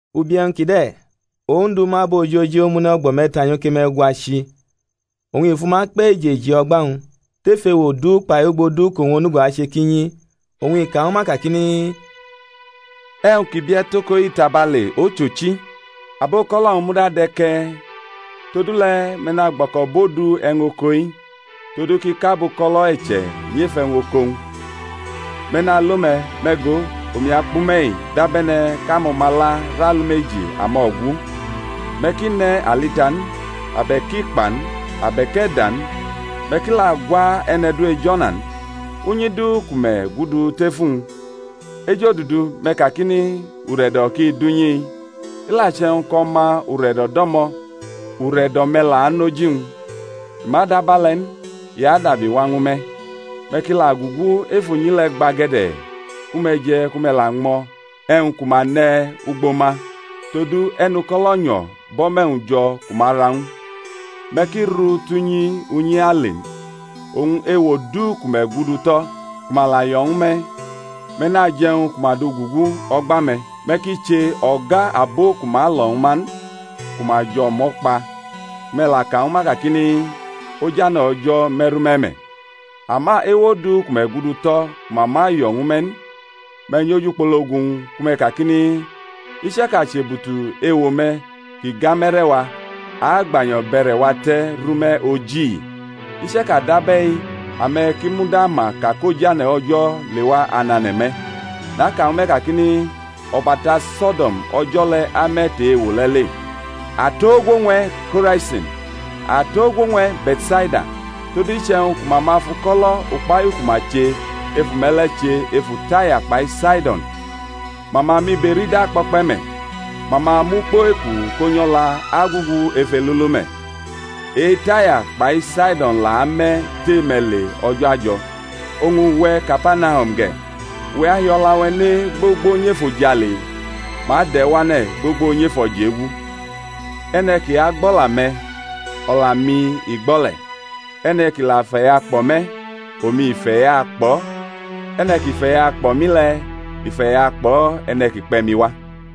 Ubi e̩wñ kide̩ Ondu mʼabo ojoji omune̩ o̩gbo̩ me̩ta nyoke me̩gwa chi, oñ i fʼuma kpe̩ eji eji o̩gba-wñ, tef ewo du kpai ugbo du kʼowñ onugo ache kʼi nyi. Oñ i ka ñwu ma kakini, E̩wñ ki bie̩ tʼoko-i tabale, ochochi, abuko̩lo̩-wñ muda de̩ ke̩e̩. Todule̩ me̩ nagbo̩ko̩bʼodu e̩wñ oko-i, todu kʼi kʼabuko̩lo̩ e̩che̩ nyʼef e̩wñ oko-wñ. Me̩ nalo me̩; me̩ go, omi akpʼume̩-i dabe̩ne̩ kʼamo̩mala rʼalumeji amo̩gu. Me̩ ki ne̩ alita n, abe̩k ikpa n, abe̩k e̩da n; me̩ ki la gwa e̩ne̩ du ej o̩na n. Unyi du ku me̩ la gudu tef uwñ, ejodudu me̩ kakini, Ure̩do̩ ki dʼunyi-i. I la che̩wñ kʼo̩ma ure̩do̩ dʼo̩mo̩, ure̩do̩-me̩ la anʼoji-wñ; i ma la dʼabe̩le̩ n, i adabi wa ñwu me̩. Me̩ ki la gugu ef unyi le̩ gbage̩de̩, ku me̩ je̩ ku me̩ la ñmo̩ e̩wñ ku ma ne̩ ugbo ma; todu e̩nuko̩lo̩ nyo̩ bʼo̩me̩-wñ jo̩ ku ma ra ñw u. Me̩ ki ru tʼunyi unyi ale n. Oñ ewo du ku me̩ gudu tʼo̩, ku ma la yo̩ ñwu me̩, me̩ naje̩ e̩wñ ku ma dugugu o̩gba-me̩; me̩ ki che o̩ga abo ki ma lo̩ ñwu ma n ku ma jʼo̩mo̩ kpa, ku me̩ ka ñwu ma kakini, Ojane̩ O̩jo̩ me̩ru me̩ me̩. Ama ewo du ku me̩ gudu tʼo̩ ku ma ma yo̩ ñwu me̩ n, me̩ nyʼojukpologu-wñ ku me̩ kakini, I chaka chʼebutu ewo-me̩ kʼi gamʼe̩re̩-wa, a agbanyo̩ bʼe̩re̩-wa te̩ rʼume̩ oji-i; i chaka dʼabe̩i ame̩ ki muda ma ka kʼojane̩ O̩jo̩ lewa anane̩ me̩. Naka ñwu me̩ kakini, O̩bata So̩do̩m o̩jo̩ le̩ ame̩ tʼe-ewo le̩ le. Atogwo ñw e̩, Ko̩raisin! Atogwo ñw e̩, Be̩tsaida! todu iche̩wñ ku ma ma fʼuko̩lo̩ ukpahiu ku ma che ef ume̩ le̩ che efu Taya kpai Saido̩n ma ma miberida kpo̩kpe̩ me̩, ma ma mʼukpo-eku ko nyʼo̩la agugu ef elulu me̩. E-Taya kpai Saidon la ame̩ tʼe-me̩ le o̩jo̩ ajo̩. Oñ uwe̩, Kapanahum ge̩, uwe̩ ahi o̩la ne gbogbo nyʼefojale? Ma adʼe̩ wane̩ gbogbo nyʼefo̩jegu. E̩ne̩ ki agbʼo̩la-me̩, o̩la-mi i gbo̩ le̩; e̩ne̩ ki la feyakpo̩ me̩, omi i feyakpo̩; e̩ne̩ ki feyakpo̩ mi le̩, i feyakpo̩ e̩ne̩ ki kpe̩ mi wa.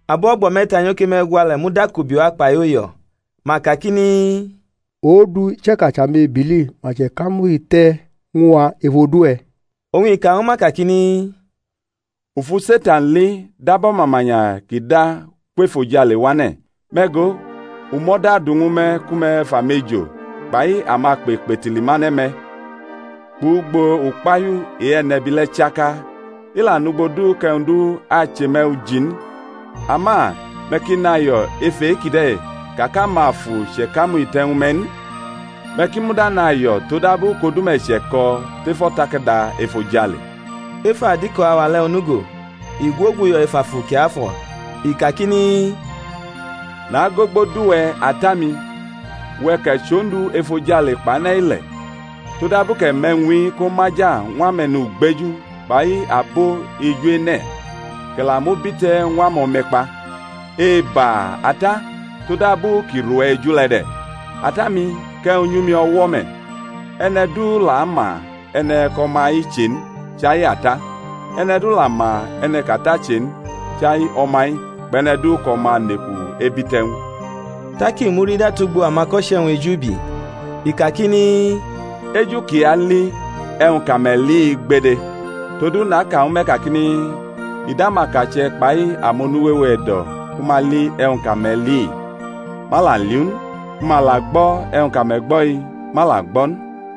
Abo o̩gbo me̩ta nyoke me̩gwa le̩ mudakubi wa kpai uyo̩; ma kakini, Ondu, i chaka chʼamebili ma chʼe̩kamuhite̩ ñw a ef odu-we̩. Oñ i ka ñwu ma kakini, U fu Setan li dab o̩mamanya kʼi da kwʼefojale wane̩. Me̩ go, u mʼo̩da du ñwu me̩ ku me̩ fʼamejo kpai amakpe kpetili mane̩ me̩, kpʼugbo ukpahiu e-e̩nebi le̩ chaka; i la nʼugbo du kʼe̩wñ du ache me̩ uji n. Ama me̩ ki nayo̩ ef e-kide̩ ka kʼamafu chʼe̩kamuhite̩ ñwu me̩ n; me̩ ki muda nayo̩ todabu kʼodu-me̩ che̩ko̩ tef o̩takada efojale. Ef adiko auwa le̩ onugo i gwoguyo̩ ef Afu Kiafo̩, i kakini, Nagogbodʼuwe̩ Ata-mi, uwe̩ kʼe̩ chʼOndu efojale kpʼane̩-ile̩, todabu kʼe̩ mʼe̩wñ-i komaja ñw ame̩nugbeju kpai abo eju-ene̩, kʼe̩ la mʼu bite̩ ñw amo̩me̩kpa. Eba, Ata, tod abu kʼi rʼuwe̩ eju le̩ de̩. Ata-mi kʼe̩wñ nyʼumi o̩wo̩ me̩; e̩ne̩ du la ma e̩ne̩ kʼO̩ma-i che n chai Ata; e̩ne̩ du la ma e̩ne̩ kʼAta che n chai O̩ma-i kpʼe̩ne̩ du kʼO̩ma neku ebite̩ ñw u. Tak i murida tugbo amako̩che̩-wñ ejubi, i kakini, Eju kʼi ali e̩wñ kʼame̩ li-i gbede! Todu naka ñwu me̩ kakini, I dʼamakache̩ kpai amonu wewe e̩do̩ ku ma li e̩wñ kʼame̩ li-i, ma la li u n; ku ma la gbo̩ e̩wñ kʼame̩ gbo̩-i, ma la gbo̩ n.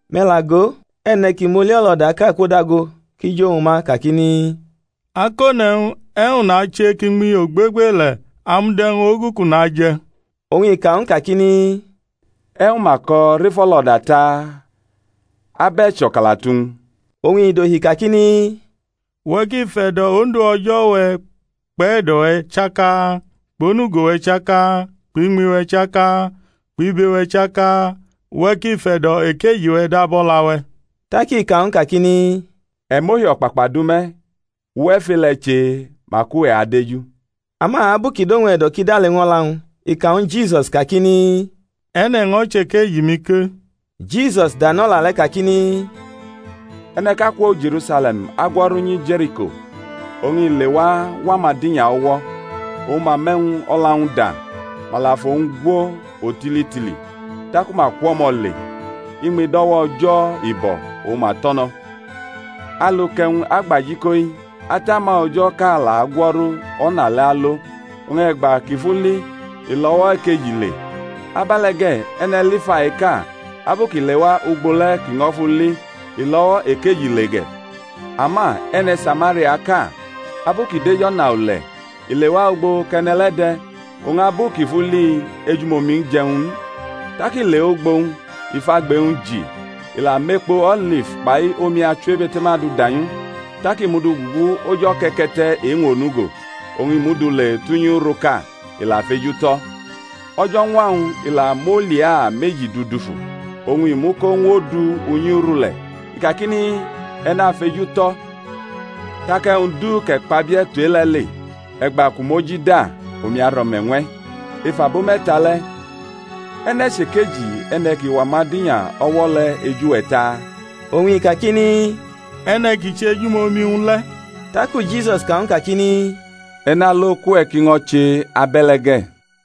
Me̩ la go, e̩ne̩ ki moli-o̩lo̩daʼka kwodago kʼi jʼowñ ma kakini, Akone̩wñ, e̩wñ nache kʼiñmi ogbegbele̩ amud e̩wñ ogu kʼu naje̩? Oñ i ka ñw u kakini, E̩wñ ma ko̩ rʼef o̩lo̩da taa? Ab e̩ cho̩kalatu-wñ? Oñ i dohi kakini, Uwe̩ ki fe̩do̩ Ondu O̩jo̩-we̩ kpʼe̩do̩-we̩ chaka, kpʼonugo-we̩ chaka, kpʼiñmi-we̩ chaka, kpʼibe-we̩ chaka; uwe̩ ki fe̩do̩ ekeji-we̩ dab o̩la-we̩. Tak i ka ñw u kakini, E̩ mʼohi o̩kpakpa du me̩; uwe̩ fʼe-le̩ che mak uwe̩ adeju. Ama abu kʼi dʼowñ e̩do̩ kʼi dale ñw o̩la-wñ, i ka ñwu Jisus kakini, E̩ne̩ ño̩ chʼekeji-mi ke? Jisus danʼo̩la le̩ kakmi, E̩ne̩ʼka kwo Je̩rusale̩m agwo̩ru nyi Je̩riko; oñ i lewa wʼamadinya o̩wo̩; ma mʼe̩wñ o̩la-wñ da, ma la fʼowñ gwo o̩titili, taku ma kwʼo̩mo̩ le, iñmi dʼo̩wo̩ O̩jo̩ i bo̩, oñ ma tʼo̩ no̩. Alu kʼe̩wñ agbajiko-i atama O̩jo̩ ʼka la agwo̩ru o̩na le̩ alo, oñ e̩gba kʼi fʼu li, i lʼo̩wo̩ ekeji le. Abe̩le̩ ge̩, e̩ne̩ Lifaiʼka, abu kʼi lewa ugbo le̩ kʼi ño̩ fʼu li, i lʼo̩wo̩ ekeji le ge̩. Ama e̩ne̩ Samariaʼka, abu kʼi dʼej o̩na ule̩, i lewa ugbo kʼe̩ne̩ le̩ de̩; oñ abu kʼi fʼu li, ejumomi-wñ je̩ ñw u n. Tak i lewʼugbo-wñ, i fʼagbe-wñ ji, i la mʼekpo-o̩lif kpai omi achiwebe̩te̩ma du danyʼu; tak i mʼu du gugu oj o̩ke̩ke̩te̩ e-wñ onugo, oñ i mʼu du le tʼunyi uruʼka, i la fejutʼo̩. O̩jo̩ñwa-wñ i la mʼolia meji dudufu, oñ i muko ñw odu unyi uru le̩ i kakini, E̩ nafejutʼo̩; tak e̩wñ du kʼe̩ kpabie̩ tu e-le̩ le, e̩gba kʼu mʼoji da omi aro̩me̩ ñw e̩. Ef abo me̩ta le̩, e̩ne̩ chʼekeji e̩ne̩ ki wʼamadinya o̩wo̩ le̩ eju-we̩ taa? Oñ i kakini, E̩ne̩ ki chʼejumomi ñw u le̩. Taku Jisus ka ñw u kakini, E̩ nalo kʼuwe̩ ki ño̩ che abe̩le̩ ge̩.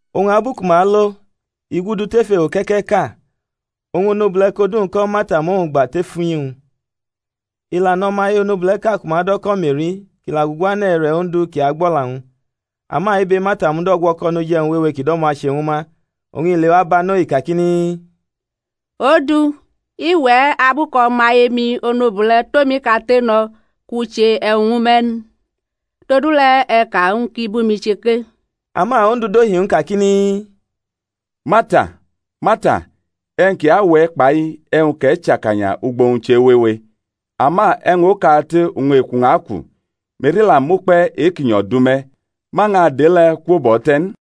Oñ abu ku ma alo, i gudu tef ewo ke̩ke̩ʼka; oñ onobule̩ kʼodu-wñ ko̩ Marta mʼowñ gba tef unyi-wñ. I la nʼo̩maye onobule̩ʼka ku ma do̩ ko̩ Me̩ri kʼi la guane̩ e̩re̩ Ondu kʼi agbʼo̩la-wñ. Ama ibe Marta mud o̩gwo̩ko̩ noj e̩wñ wewe kʼi do̩mo̩ ache ñwu ma; oñ i lewa banʼo, i kakini, Ondu, i wʼe̩ abu kʼo̩maye-mi onobule̩ tʼomi kate no̩ kʼu che e̩wñ ñwu me̩ n? Todule̩ e̩ ka ñw u kʼi bʼumi che ke. Ama Ondu dohi ñw u kakini, Marta, Marta, e̩wñ ki awʼe̩ kpai e̩wñ kʼe̩ chʼakanya ugbo-wñ chewewe; ama e̩wñ okate oñ eku-wñ aku; Me̩ri la mʼukpe̩ e-ki nyo̩ du me̩, ma ñʼadʼe-le̩ kwobʼo̩ te̩ n.